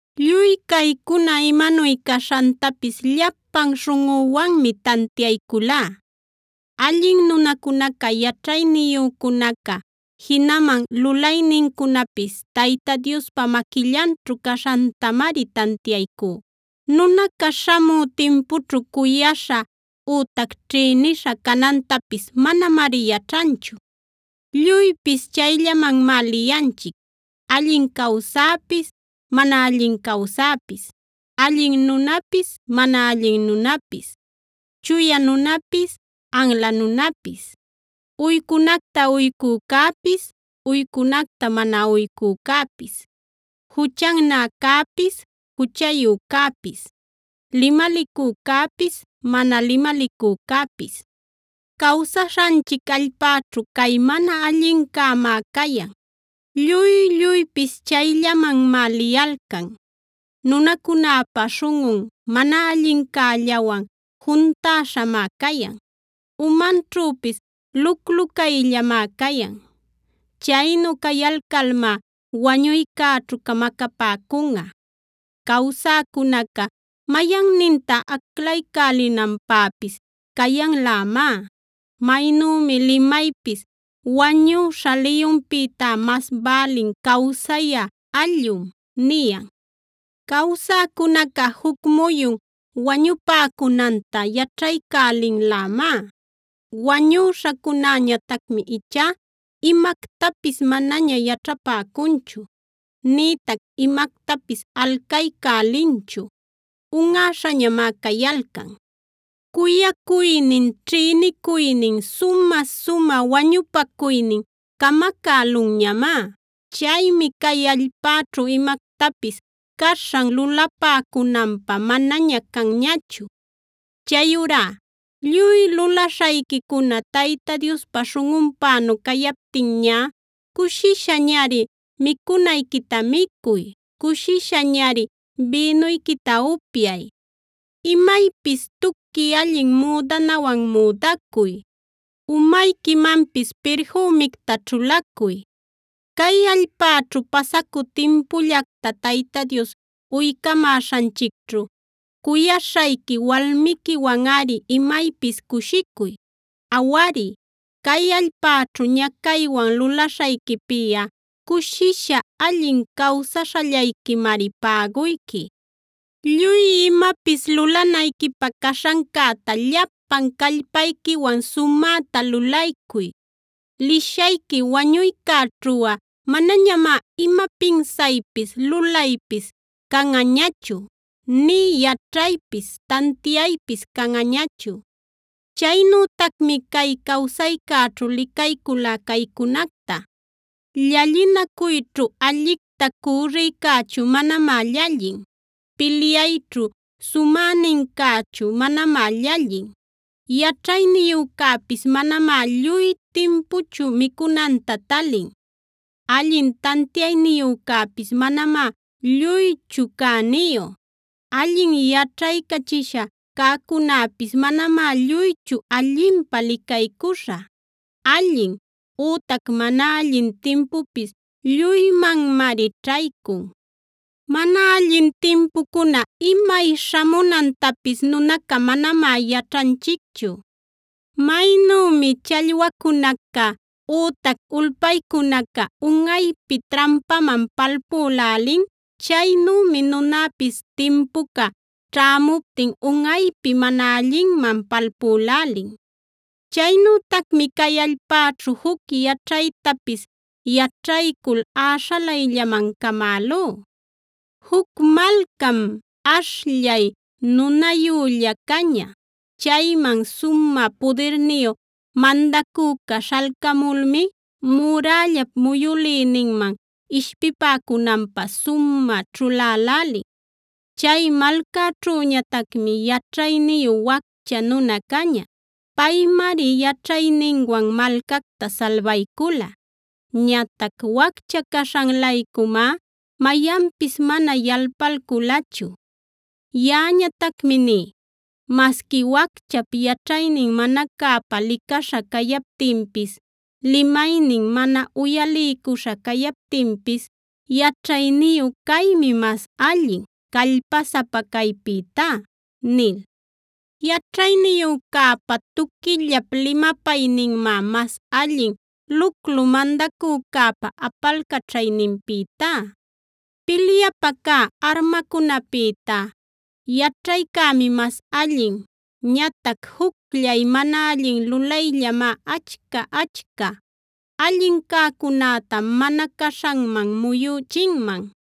Lluy caycuna imanuy caśhantapis llapan śhunꞌüwanmi tantiayculá. Allin nunacunaca yaćhayniyücunaca jinaman lulaynincunapis Tayta Diospa maquillanćhu caśhantamari tantiaycú.a Nunaca śhamü timpućhu cuyaśha ütac ćhïnisha canantapis manamari yaćhanchu. Lluypis chayllamanmá liyanchic: allin cawsäpis mana allin cawsäpis, allin nunapis mana allin nunapis, chuya nunapis anla nunapis, uycunacta uycücäpis uycunacta mana uycücäpis, juchannäcäpis juchayücäpis, limalicücäpis mana limalicücäpis. Cawsaśhanchic allpäćhu cay mana allincämá cayan: Lluy-lluypis chayllamanmá liyalcan; nunacunäpa śhunꞌun mana allincällawan juntäśhamá cayan; umanćhüpis luclu cayllamá cayan. Chaynu cayalcalmá wañuycäćhu camacapäcunꞌa. Cawsäcunaca mayanninta aclaycälinanpäpis cayanlämá. Maynümi limaypis “wañüśha liyunpïtá mas bälin cawsayä allꞌum” niyan. Cawsäcunaca juc muyun wañupäcunanta yaćhaycälinlämá; wañüśhacunäñatacmi ichá imactapis manaña yaćhapäcunchu, nïtac imactapis alcaycälinchu; unꞌäśhañamá cayalcan. Cuyacuynin, ćhïnicuynin, sumä-sumä wañupacuynin camacälunñamá. Chaymi cay allpäćhu imactapis caśhan lulapäcunanpä manaña canñachu. Chayurá lluy lulaśhayquicuna Tayta Diospä śhunꞌunpänu cayaptinñá cushishañari micunayquita micuy; cushishañari bïnuyquita upyay. Imaypis tuqui allin müdanawanb müdacuy; umayquimanpis pirfümicta ćhulacuy. Cay allpäćhu pasacü timpullacta Tayta Dios uycamäśhanchicćhu cuyaśhayqui walmiquiwanꞌari imaypis cushicuy.c Awari, cay allpäćhu ñacaywan lulaśhayquipiꞌa cushisha allin cawsaśhallayquimari päguyqui. Lluy imapis lulanayquipä caśhancäta llapan callpayquiwan sumäta lulaycuy; lishayqui wañuycäćhuꞌa manañamá ima pinsaypis, lulaypis canꞌañachu; nï yaćhaypis, tantiaypis canꞌañachu. Chaynütacmi cay cawsaycäćhu licayculá caycunacta: Llallinacuyćhu allicta cürricächu manamá llallin; pilyayćhu sumänincächu manamá llallin; yaćhayniyücäpis manamá lluy timpuchu micunanta talin; allin tantiayniyücäpis manamá lluychu cäniyu; allin yaćhaycachisha cäcunäpis manamá lluychu allinpä licaycuśha. Allin ütac mana allin timpupis lluymanmari ćhaycun. Mana allin timpucuna imay śhamunantapis nunaca manamá yaćhanchicchu. Maynümi challwacunaca ütac ulpaycunaca unꞌaypi trampaman palpülälin, chaynümi nunäpis timpuca ćhämuptin unꞌaypi mana allinman palpülälin. Chaynütacmi cay allpäćhu juc yaćhaytapis yaćhaycul äśhalayllaman camälú: Juc malcam ashllay nunayülla caña; chayman sumä pudirniyu mandacüca śhalcamulmi murällap muyülïninman ishpipäcunanpä sumä ćhulälälin. Chay malcaćhüñatacmi yaćhayniyu waccha nuna caña. Paymari yaćhayninwan malcacta salbaycula; ñatac waccha caśhan-laycumá mayanpis mana yalpalculachu. Yaꞌañatacmi ní: “Masqui wacchap yaćhaynin mana cäpa licaśha cayaptinpis, limaynin mana uyaliycuśha cayaptinpis yaćhayniyud caymi mas allin callpasapa caypïtá” nil. Yaćhayniyücäpa tuquillap limapayninmá mas allin luclu mandacücäpa apalcaćhayninpïtá. Pilyapä cä armacunäpïtá yaćhaycämi mas allin. Ñatac jucllay mana allin lulayllamá achca-achca allin cäcunäta mana caśhanman muyüchinman.